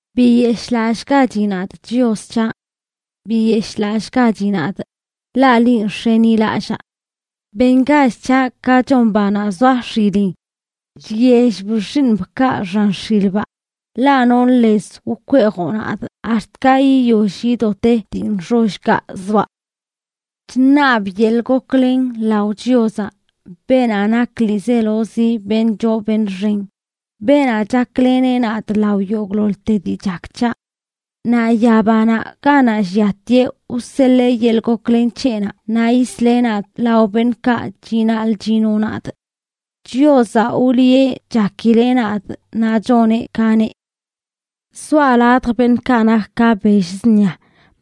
Biyeshꞌlallꞌgachi nadꞌ, Chios c̱haꞌ. Biyeshꞌlallꞌgachi nadꞌ, ḻaꞌ linꞌ nx̱enilallaa. Bengach c̱haꞌ ka chon banaꞌ zoa x̱ilin chyellb xiiṉbkaꞌ xan x̱ilbaꞌ, ḻaꞌ nonꞌ lez wkweejoꞌ nadꞌ ax̱t ka yiyoll yido te dii nxollkaꞌ zoaꞌ. Chṉabꞌ yeḻꞌ goklen lao Chiozaꞌ, beenaꞌ nak ḻiizelozi beṉꞌ choo beṉꞌ xen, beenaꞌ chakleneꞌ nadꞌ lao yogꞌḻoḻte dii chak c̱haꞌ. Naꞌ yabanaꞌ ganaꞌ lliatieꞌ wseḻee yeḻꞌ goklen c̱heꞌnaꞌ naꞌ yisleꞌ nadꞌ lao beṉꞌkaꞌ chinaḻꞌ chino nadꞌ. Chiozaꞌ wliꞌe chakileꞌ nadꞌ naꞌ choneꞌ ka neꞌ. Zoaꞌ ladj beṉꞌkaꞌ nak ka bell zṉia,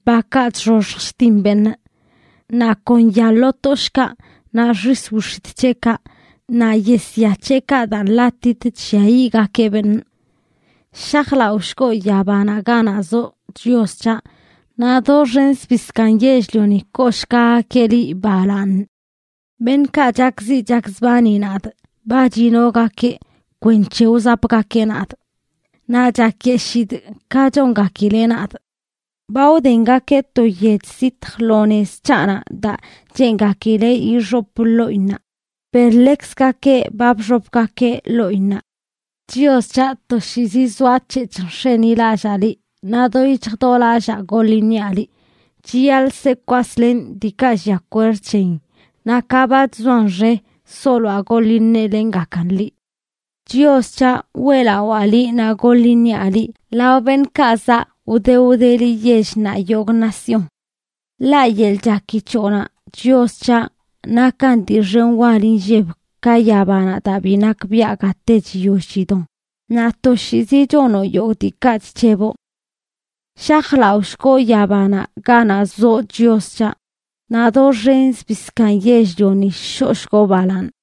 bakaꞌ chxoxj chtin beṉꞌ. Naꞌ kon ya lo toshꞌkaꞌ, naꞌ xis wix̱itꞌ c̱heꞌkaꞌ, naꞌ yesya c̱hekaꞌ daa nḻatitə chlliayiꞌgakeꞌ beṉꞌ. ¡Shajlaꞌoshgoꞌ yabanaꞌ ganaꞌ zoꞌ, Chios c̱haꞌ, naꞌ doxen zbii zkaaṉ yell-lioni kooshgagakeꞌ liꞌ balaaṉ! Beṉꞌkaꞌ chakziꞌ chakzbani nadꞌ ba chinogakeꞌ kwenc̱he wzapgakeꞌ nadꞌ, naꞌ chakyeshidꞌ ka chongakileꞌ nadꞌ. Ba wdengakeꞌ to yech zitj lo nez c̱haꞌnaꞌ daa cheengakileꞌ ixopꞌ ḻoꞌinnaꞌ, per ḻekzgakeꞌ ba bxopgakeꞌ ḻoꞌinnaꞌ. Chios c̱haꞌ, toshiizi zoac̱hec̱hꞌ nx̱enilallaa liꞌ, naꞌ do yic̱hj do lallaa goḻ iṉiaꞌ liꞌ. Chiyaḻꞌ se kwaslenꞌ diikaꞌ llia kwerd c̱heyin, naꞌ ka ba chzoan xe soloaꞌ goḻ iṉelenꞌgakan liꞌ. Chios c̱haꞌ, weꞌlawaa liꞌ naꞌ goḻ iṉiaꞌ liꞌ lao beṉꞌkaꞌ zaꞌ wde wdeli yell naꞌ yogꞌ nación. Ḻaꞌ yeḻꞌ chaki c̱hoꞌnaꞌ, Chios c̱haꞌ, nakan dii xen wal inlleb ka yabanaꞌ daa bi nakbiaꞌ gate chiyoll chidon, naꞌ toshiizi chonoꞌ yogꞌ diikaꞌ chc̱heboꞌ. ¡Shajlaꞌoshgoꞌ yabanaꞌ ganaꞌ zoꞌ, Chios c̱haꞌ, naꞌ doxen zbii zkaaṉ yell-lioni shoꞌshgoꞌ balaaṉ!